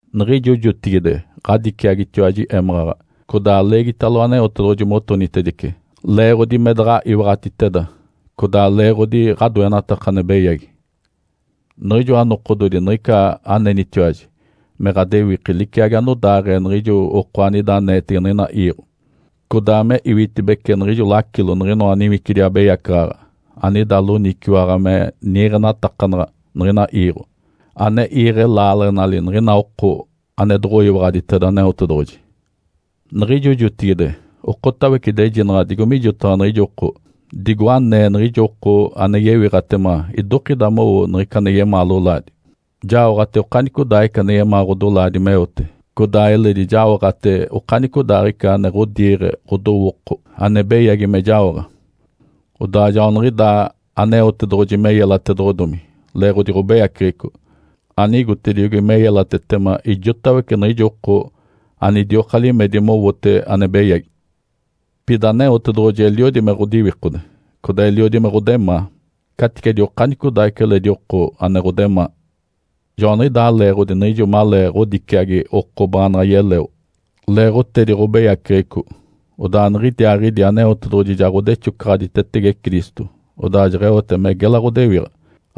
Niɡ̶ijo jotigide ɡ̶adiciagitiwaji émaɡ̶aɡ̶a, codaa leegitalo Aneotedoɡ̶oji motonitedice, leeɡ̶odi me daɡ̶a iwaɡ̶atiteda codaa leeɡ̶odi ɡ̶adoenataka ane beyagi. Niɡ̶ijoa nokododi niɡ̶ica anenitiwaji me ɡ̶adewiki liciagi anodaaɡ̶ee niɡ̶ijo oko anida aneetege niɡ̶ina iiɡ̶o, codaa me iwitibece niɡ̶ijo lacilo niɡ̶inoa niwicidi abeyacaɡ̶aɡ̶a anida loniciwaɡ̶a me niiɡ̶enatakanaɡ̶a niɡ̶ina iiɡ̶o, ane iiɡ̶e laaleɡ̶enali niɡ̶ina oko ane doɡ̶oyiwaɡ̶aditeda Aneotedoɡ̶oji. Niɡ̶ijo jotigide okotawece idejinaɡ̶a digo mijotaɡ̶a niɡ̶ijo oko, digo anee niɡ̶ijo oko ane yewiɡ̶atema idokida mowo niɡ̶ica ane yemaa lolaadi. Jaoɡ̶ate okanicodaaɡ̶ica ane yemaa ɡ̶odolaadi meote, codaa eledi jaoɡ̶ate okanicodaaɡ̶ica ane ɡ̶odiiɡ̶e ɡ̶odowooko ane beyagi me jaoɡ̶a. Odaa joaniɡ̶idaa Aneotedoɡ̶oji me yelatedoɡ̶odomi leeɡ̶odi ɡ̶obeyaceɡ̶eco, anigotediogi me yelatetema ijotawece niɡ̶ijo oko anidioka limedi mowote ane beyagi. Pida Aneotedoɡ̶oji eliodi me ɡ̶odiwikode, codaa eliodi me ɡ̶odemaa, caticedi okanicodaaɡ̶ica eledi oko ane ɡ̶odemaa. Joaniɡ̶idaa leeɡ̶odi niɡ̶ijo malee ɡ̶odiciagi oko baanaɡ̶a yeleo leeɡ̶otedi ɡ̶obeyaceɡ̶eco, odaa niɡ̶idiaaɡ̶idi Aneotedoɡ̶oji ja ɡ̶odexocaɡ̶aditetege Cristo, odaa jeɡ̶eote me gela ɡ̶odewiɡ̶a.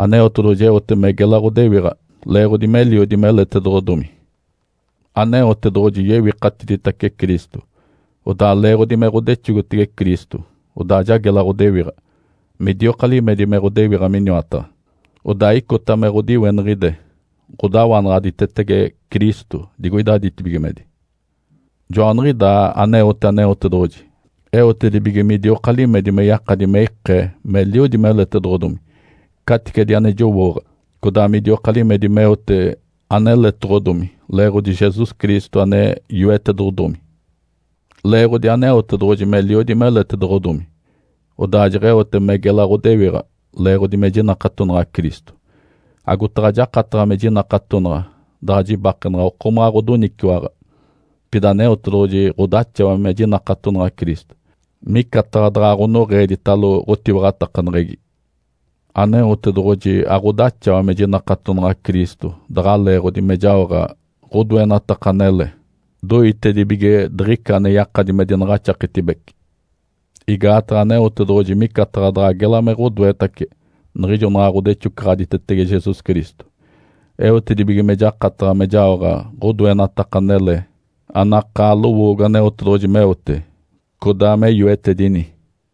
Aneotedoɡ̶oji eote me gela ɡ̶odewiɡ̶a leeɡ̶odi meliodi meletedoɡ̶odomi. Aneotedoɡ̶oji yewikatiditace Cristo, odaa leeɡ̶odi me ɡ̶odexogotege Cristo, odaa ja gela ɡ̶odewiɡ̶a, midioka limedi me ɡ̶odewiɡ̶a miniwataɡ̶a. Odaa icota me ɡ̶odiweniɡ̶ide ɡ̶odawanaɡ̶aditetege Cristo digoida ditibigimedi. Joaniɡ̶idaa aneote Aneotedoɡ̶oji eotedibige midioka limedi me yakadi me ikee meliodi meletedoɡ̶odomi caticedi ane jowooɡ̶a, codaa midioka limedi meote aneletoɡ̶odomi leeɡ̶odi Jesus Cristo ane yoetedoɡ̶odomi. Leeɡ̶odi Aneotedoɡ̶oji meliodi meletedoɡ̶odomi, odaa jeɡ̶eote me gela ɡ̶odewiɡ̶a leeɡ̶odi me jinakatonaɡ̶a Cristo. Agotaɡ̶a jakataɡ̶a me jinakatonaɡ̶a daɡ̶a jibakenaɡ̶a okomaɡ̶a ɡ̶odoniciwaɡ̶a, pida Aneotedoɡ̶oji ɡ̶odaxawa me jinakatonaɡ̶a Cristo, micataɡ̶a daɡ̶a ɡ̶onoɡ̶eeditalo ɡ̶otiwaɡ̶atakaneɡ̶egi. Aneotedoɡ̶oji aɡ̶odaxawa me jinakatonaɡ̶a Cristo daɡ̶a leeɡ̶odi me jaoɡ̶a ɡ̶odoenataka anele, doitedibige diɡ̶ica ane yakadi me dinaɡ̶axaketibece. Igaataɡ̶a Aneotedoɡ̶oji micataɡ̶a daɡ̶a gela me ɡ̶odoetace niɡ̶ijo naɡ̶a ɡ̶odexocaɡ̶aditetege Jesus Cristo, eotedibige me jakataɡ̶a me jaoɡ̶a ɡ̶odoenataka anele anakaa lowoogo Aneotedoɡ̶oji meote, codaa me yoetedini.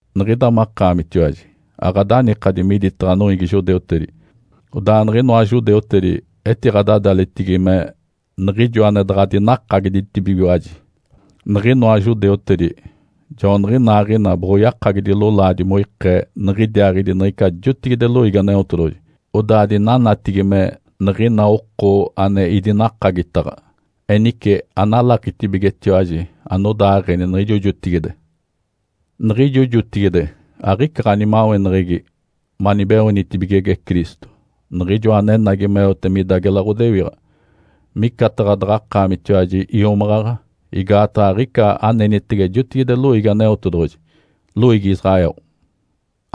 Niɡ̶ida makaamitiwaji aɡ̶adanikadi miditaɡ̶a noiigi judeutedi. Odaa niɡ̶inoa judeutedi etiɡ̶adadalitigi me “Niɡ̶ijo ane daɡ̶a dinakagiditibigiwaji”. Niɡ̶inoa judeutedi joaniɡ̶inaaɡ̶ina boɡ̶oyakagidi lolaadi moikee niɡ̶idiaaɡ̶idi niɡ̶ica jotigide loiigi Aneotedoɡ̶oji, odaa dinanatigi me, “Niɡ̶ina oko ane idinakagitaɡ̶a.” Enice analakitibigetiwaji anodaaɡ̶eni niɡ̶ijo jotigide. Niɡ̶ijo jotigide aɡ̶ica ɡ̶animaweneɡ̶egi manibeoonitibigege Cristo, Niɡ̶ijoa anenagi meote mida gela ɡ̶odewiɡ̶a. Micataɡ̶a daɡ̶akaamitiwaji iomaɡ̶aɡ̶a, igaataɡ̶a aɡ̶ica anenitege jotigide loiigi Aneotedoɡ̶oji, loiigi Israel.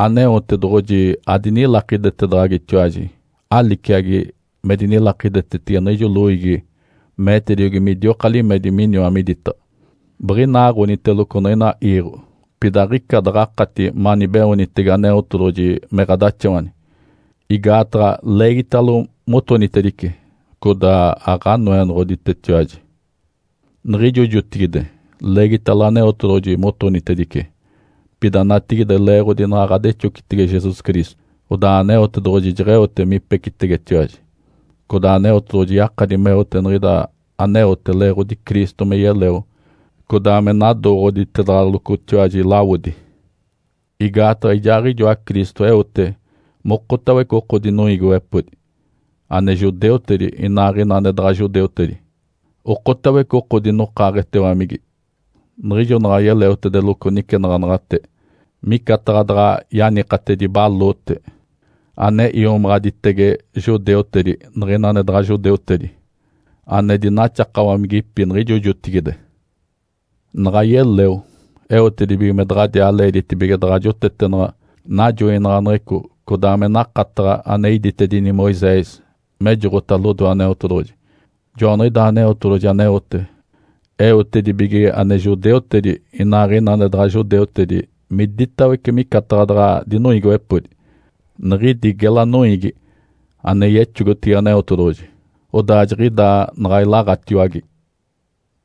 Aneotedoɡ̶oji adinilakidetedaɡ̶agitiwaji aliciagi me dinilakidetetege niɡ̶ijo loiigi meetediogi midioka limedi miniwa miditaɡ̶a. Biɡ̶inaaɡ̶oniteloco niɡ̶ina iiɡ̶o, pida aɡ̶ica daɡ̶akati manibeoonitege Aneotedoɡ̶oji me ɡ̶adaxawani, igaataɡ̶a leegitalo motonitedice, codaa aɡ̶aNoenoɡ̶oditetiwaji. Niɡ̶ijo jotigide leegitalo Aneotedoɡ̶oji motonitedice. Pida natigide leeɡ̶odi naɡ̶a ɡ̶adexocitege Jesus Cristo, odaa Aneotedoɡ̶oji jeɡ̶eote mipecitegetiwaji. Codaa Aneotedoɡ̶oji yakadi meote niɡ̶ida aneote leeɡ̶odi Cristo me yeleo codaa me nadooɡ̶oditedaɡ̶alocotiwaji lawodi. Igaataɡ̶a ijaaɡ̶ijoa Cristo eote mokotawece oko dinoiigiwepodi, ane judeutedi, inaaɡ̶ina ane daɡ̶a judeutedi, okotawece oko dinokaaɡ̶etewamigi. Niɡ̶ijo naɡ̶a yeleotedeloco nicenaɡ̶anaɡ̶ate, micataɡ̶a daɡ̶a yanikatedi baloote ane iomaɡ̶aditege judeutedi niɡ̶ina ane daɡ̶a judeutedi ane dinaxakawamigipi niɡ̶ijo jotigide. Naɡ̶a yeleo, eotedibige me daɡ̶adiaa leeditibige daɡ̶a jotetenaɡ̶a najoinaɡ̶aneɡ̶eco codaa me nakataɡ̶a ane iditedini Moisés mejoɡ̶ota lodoe Aneotedoɡ̶oji. Joaniɡ̶idaa Aneotedoɡ̶oji aneote, eotedibige ane judeutedi inaaɡ̶ina ane daɡ̶a judeutedi miditawece micataɡ̶a daɡ̶a dinoiigiwepodi, niɡ̶idi gela noiigi ane yexogotege Aneotedoɡ̶oji, odaa jiɡ̶idaa naɡ̶a ilaɡ̶atiwage.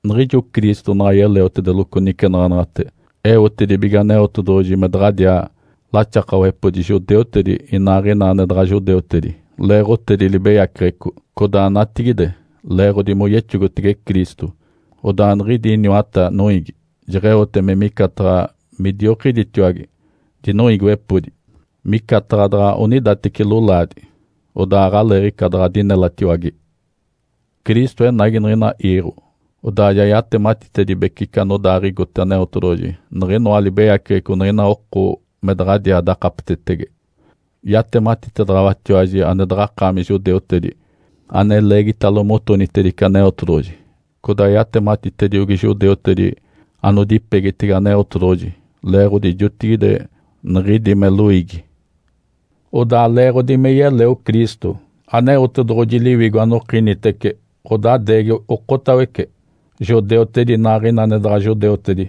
Niɡ̶ijo Cristo naɡ̶a yeleotedeloco nicenaɡ̶anaɡ̶ate, eotedibige Aneotedoɡ̶oji me daɡ̶adiaa laxakawepodi judeutedi inaaɡ̶ina ane daɡ̶a judeutedi leeɡ̶otedi libeyaceɡ̶eco. Codaa natigide leeɡ̶odi moyexogotege Cristo, odaa niɡ̶idi iniwata noiigi jeɡ̶eote me micataɡ̶a midiokiditiwage dinoiigiwepodi, micataɡ̶a daɡ̶a onidateci lolaadi, odaa aɡ̶aleeɡ̶ica daɡ̶a dinelatiwage. Cristo enagi niɡ̶ina iiɡ̶o, odaa ja yatematitedibece ica anodaaɡ̶igote Aneotedoɡ̶oji niɡ̶inoa libeyaceɡ̶eco niɡ̶ina oko me daɡ̶adiaa dakapetetege. Yatematitedaɡ̶awatiwaji ane daɡ̶akaami judeutedi, ane leegitalo motonitedice Aneotedoɡ̶oji, codaa yatematitediogi judeutedi anodipegitege Aneotedoɡ̶oji leeɡ̶odi jotigide niɡ̶idi me loiigi. Odaa leeɡ̶odi me yeleo Cristo, Aneotedoɡ̶oji Liwigo anokinitece ɡ̶odadeegi okotawece, judeutedi inaaɡ̶ina ane daɡ̶a judeutedi,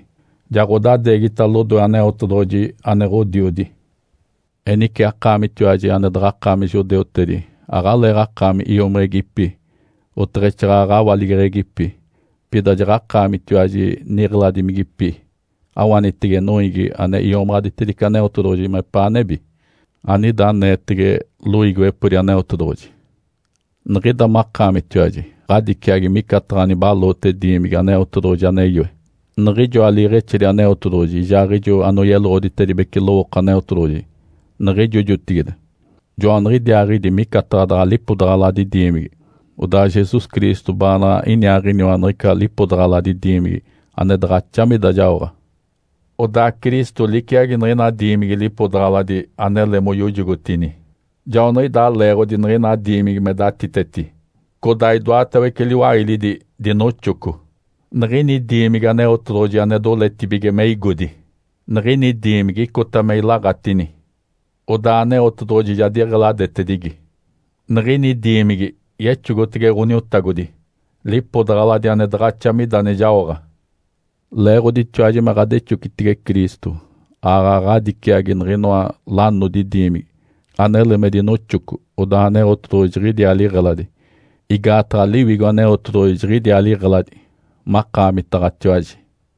ja ɡ̶odadeegita lodoe Aneotedoɡ̶oji ane Ǥodiodi. Enice akaamitiwaji ane daɡ̶akaami judeutedi aɡ̶aleeɡ̶akaami iomiɡ̶igipi, oteɡ̶exaaɡ̶aɡ̶a awaligeɡ̶egipi. Pida jaɡ̶akaamitiwaji niɡ̶eladimigipi awanitege noiigi ane iomaɡ̶aditedice Aneotedoɡ̶oji mepaa nebi, anida aneetege loiigiwepodi Aneotedoɡ̶oji. Niɡ̶ida makaamitiwaji ɡ̶adiciagi micataɡ̶a nibaloote diimigi Aneotedoɡ̶oji ane yoe. Niɡ̶ijoa liiɡ̶exedi Aneotedoɡ̶oji ijaaɡ̶ijo anoyeloɡ̶oditedibece lowooko Aneotedoɡ̶oji niɡ̶ijo jotigide, joaniɡ̶idiaaɡ̶idi micataɡ̶a daɡ̶a lipodaɡ̶aladi diimigi, odaa Jesus Cristo baanaɡ̶a iniaaɡ̶iniwa niɡ̶ica lipodaɡ̶aladi diimigi ane daɡ̶axa mida jaoɡ̶a. Odaa Cristo liciagi niɡ̶ina diimigi lipodaɡ̶aladi anele moyojogotini, joaniɡ̶idaa leeɡ̶odi niɡ̶ina diimigi me datiteti, codaa idoatawece liwailidi dinoxoco. Niɡ̶ini diimigi Aneotedoɡ̶oji ane doletibige me igodi, niɡ̶ini diimigi icota me ilaɡ̶atini. Odaa Aneotedoɡ̶oji ja diɡ̶eladetedigi. Niɡ̶ini diimigi yexogotege Ǥoniotagodi, lipodaɡ̶aladi ane daɡ̶axa mida ane jaoɡ̶a. Leeɡ̶oditiwaji me ɡ̶adexocitege Cristo, aaɡ̶aɡ̶a ɡ̶adiciagi niɡ̶inoa lanodi diimigi, anele me dinoxoco, odaa Aneotedoɡ̶oji jiɡ̶idiaa liɡ̶eladi, igaataɡ̶a Liwigo Aneotedoɡ̶oji jiɡ̶idiaa liɡ̶eladi makaamitaɡ̶atiwaji.